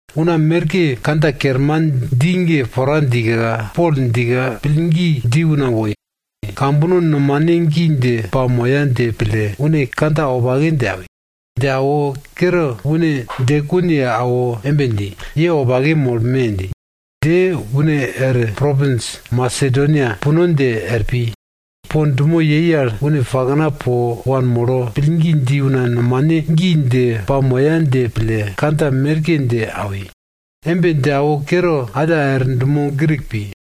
Una merke kandja kerman dji ge pora djika, Pol djika pillgi dji una woi. Kambono nomane gi dje pamoya dje pille une kandja wopake dje awi. Dje awo kere une djekun ye awo embe dji, ye wopake molme! dji. Dje une er propins Masedonia puno dje er pi. Po dumo yei al une pakna po wanmolo, pillgi dji una nomane gi dje pamoya dje pille kandja merke dje awi. Embe dje awo kere alla er dumo Grik pi.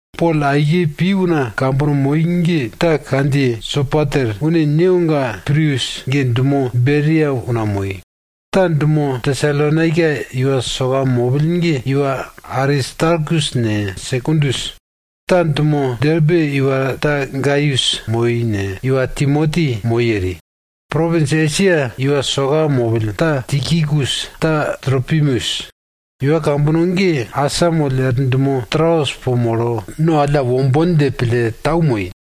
Pol aike pi una kambono moi ge ta kandjiye Sopater (une newoga Pirus ge dumo Beria una moi). Ta dumo Tesalonaika iwa soka mopill ge iwa Aristarkus ne, Sekundus. Ta dumo Derbe iwa ta Gaius moi, alla iwa Timoti moi eri. Propins Esia iwa soka mopill, ta Tikikus, ta Tropimus. Iwa kambono ge asamoll er dumo Troas po molo, no alla wombon dje pille tau moi.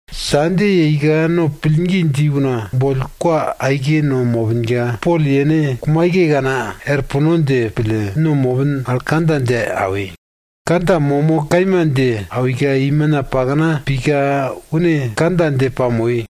Sande yeika no pillgi dji una boll kwa aike no mopinka, Pol yene kumaikekana er puno dje pille, no mopin al kandja dje awi. Kandja momo kaima dje awika, imina pakna pika une kandja dje pamoi.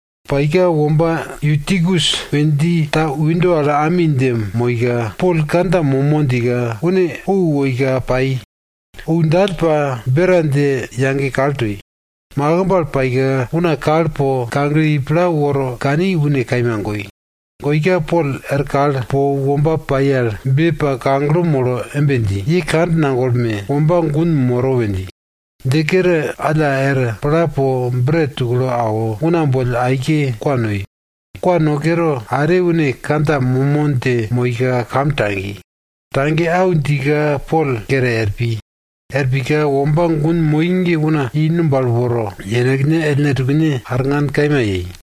Paika womba Yutikus we dji ta windo al ami dje moika, Pol kandja momo djika, une ou woika pai. Ou dall pa, bera dje yage kal toi. Makimb al paika, una kal po kagle i pla woro kani une kaima goi. Goika, Pol er kal po womba pai al be pa kagle molo embe dji, ye kand nagolme! Womba gun moro! we dji. Dje kere alla er pla po bret tuklo awo, una boll aike kwa noi. Kwa no kere are une kandja momo dje moika kam tagi. Tage au djika Pol kere er pi. Er pika womba gun moi ge una i numb al woro, yenekne ellne tukene arngan kaima yei.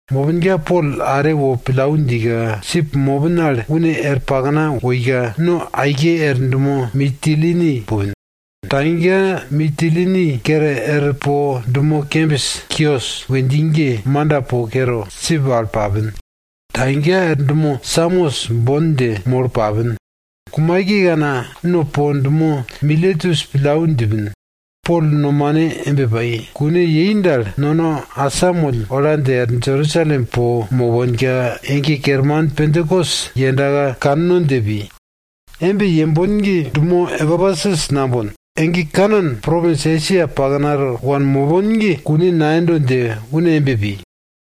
Mopinka Pol are wo pillau djika, sip mopin al une er pakna woika, no aike er dumo Mitilini pupin. Tagika Mitilini kere er po dumo kembis Kios we dji ge manda po kere, sip al papin. Tagika er dumo Samos bon dje molo papin. Kumaikekana no po dumo Miletus pillau djipin. Pol nomane embe pai, kune yei dal, nono asamoll ola dje er Jerusalem po moponka, ege kerman Pentakos yendaka kanno dje pi. Embe yembon ge dumo Epesus nambon. Ege kanan propins Esia paknato wanmopon ge kune nayendo dje une embe pi.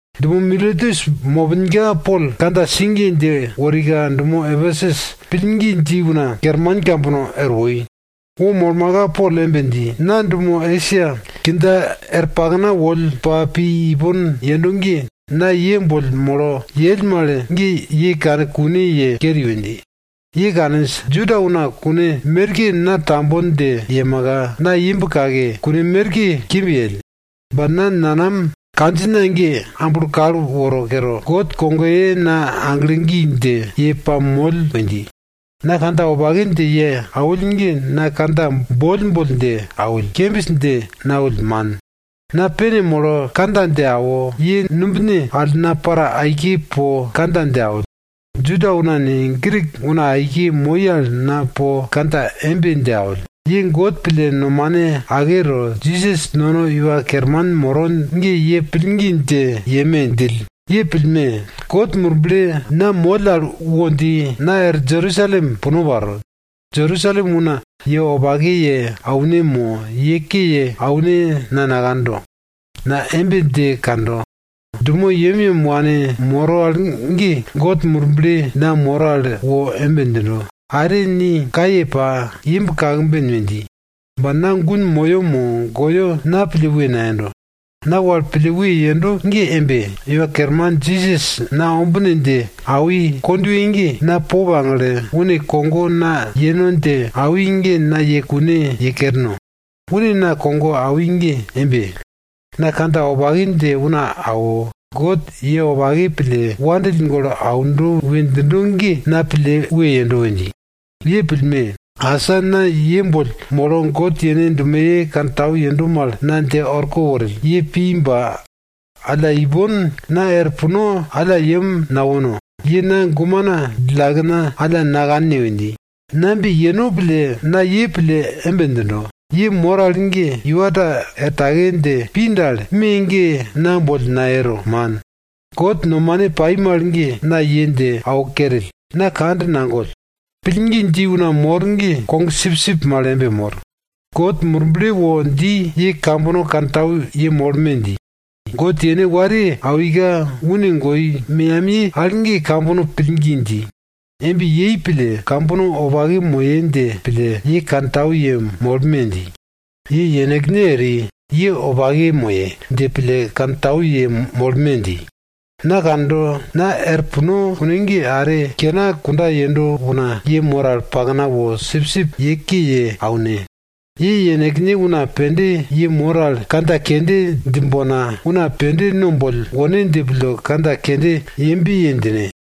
Dumo Miletus mopinka Pol kandja sigiye dje worika dumo Epesus pillgi dji una kerman kambono er woi. Wo molmaka Pol embe dji, na dumo Esia kindja er pakna wo molo pa woll ipon yero ge, na ye boll molo yell mal ge ye kane kune ye keri we dji. Ye kaninj, Juda una kune merke na tambon dje yemaka, na imb kake, kune merke kimb yell. Ba na nanam kandjina ge amblo kal woro kere, God kogoye na aglo gi dje ye pamoll we dji. Na kandja wopake dje ye awill ge na kandja boll boll dje awill, kembis dje nawill man. Na pene molo kandja dje awo, ye numbine al na para aike po kandja dje awill. Juda una ne, Grik una aike moi al na po kandja embe dje awill, ye God pille nomane ake to, Jisas nono Iwa Kerman moro ge ye pillgi dje yeme! djill. Ye pillme! God Murble na moll al wo dji, na er Jerusalem puno paro. Jerusalem una na ye wopake ye aune mo, ye ke ye aune na nakando. Na embe dje kando, dumo yemyem wanmoro al ge God Murble na moro al wo embe djindo, are ni kaye pa, imb kakben we dji. Ba na gun moyo mo goyo, na pille we nayendo. Na wal pille we yendo ge embe, Iwa Kerman Jisas na ombine dje awi kondwe ge, na po pagle, une kogo na yeno dje awi ge na ye kune ye kerno. Une na kogo awi ge embe, Jisas kandjiyebe wopake pai al ge God nono ye wopake ye awi. Awi mal ge na po una dje auno we dji. Ye pillme! Asa na ye boll molo God yene dumoye wopake kantau yendo mal na dje orko worill, ye pi ba alla, ipon na er puno alla yem nawono. Ye na gumena djillakena alla nakanne we dji. Na embe yeno pille na ye pille embe djindo, ye mor al ge iwa ta er take dje pi dal, me ge na boll nayero, man. God nomane pai mal ge na ye dje awo kerill, na kand nagoll. Pillgi dji una mor ge kogsipsip mal embe mor. God Murble wo dji, ye kambono kantau yemolme! dji. God yene wariye awika, une goi meyamiye al ge kambono pillgi dji. Embe yei pille kambono wopake moye dje pille ye kantau yemolme! dji. Ye yenekne para, ye wopake mopon dje pille kantau yemolme! dji. Na kando, na er puno kune ge, are kena simbill wo ye pakna mor al sipsip ye ke ye aune. Ye yenekne una pende ye mor al kandja kende djimbonka, una pende no boll wone dje pille kandja kende yembe ye djine.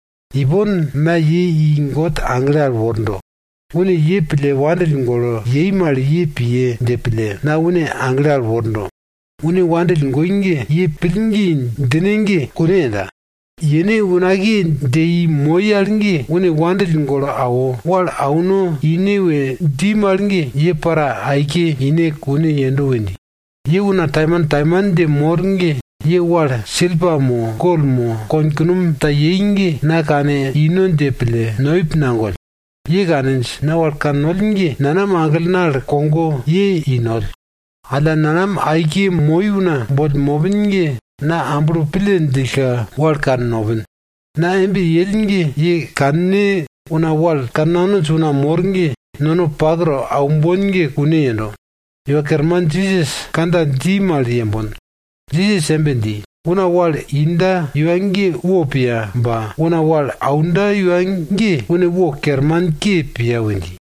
Ipon na ye i God agle al wordo. Une nono wopake pille aundo mal ye piye dje pille na une agle al wordo. Une nono wopake pille aundo ge, ye pillgi djine ge kune yenda. Yene unakiye dje i moi al ge une wopake pille awo, wal auno ine we dji mal ge, ye para aike ine kune yendo we dji. Ye una taimantaiman dje mor ge ye wal silpa mo, gol mo, konkunom ta yei ge na kanino dje pille noip nagoll. Ye kaninj, na wal kannoll ge nanam aglena al kogo ye i noll. Alla nanam aike moi una boll mopin ge na amblo pille djillka, wal kannopin. Na embe yell ge ye kanne, una wal kannanonj una mor ge nono pak to aumbon ge kune yendo. Iwa Kerman Jisas kandja dji mal yembon. Jisas embe dji, una wal inda iwa ge wo piya ba, una wal aunda iwa ge une wo kermanke piya we dji.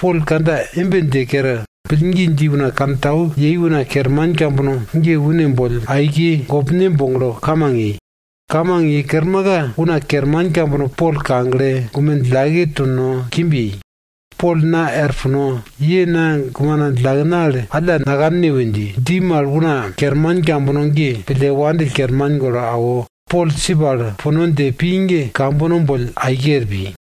Pol kandja embe dje kere, pillgi dji una kantau yei una kerman kambono ge une boll aike gopne boglo kamang yei. Kamang ye kermaka, una kerman kambono po Pol kagle, gume djillake to no, kimb yei. Pol na er puno, ye na gumena djillakena alla nakanne we dji mal una kerman kambono ge pille wandill kerman golo awo, Pol sip al puno dje pi ge kambono boll aike er pi.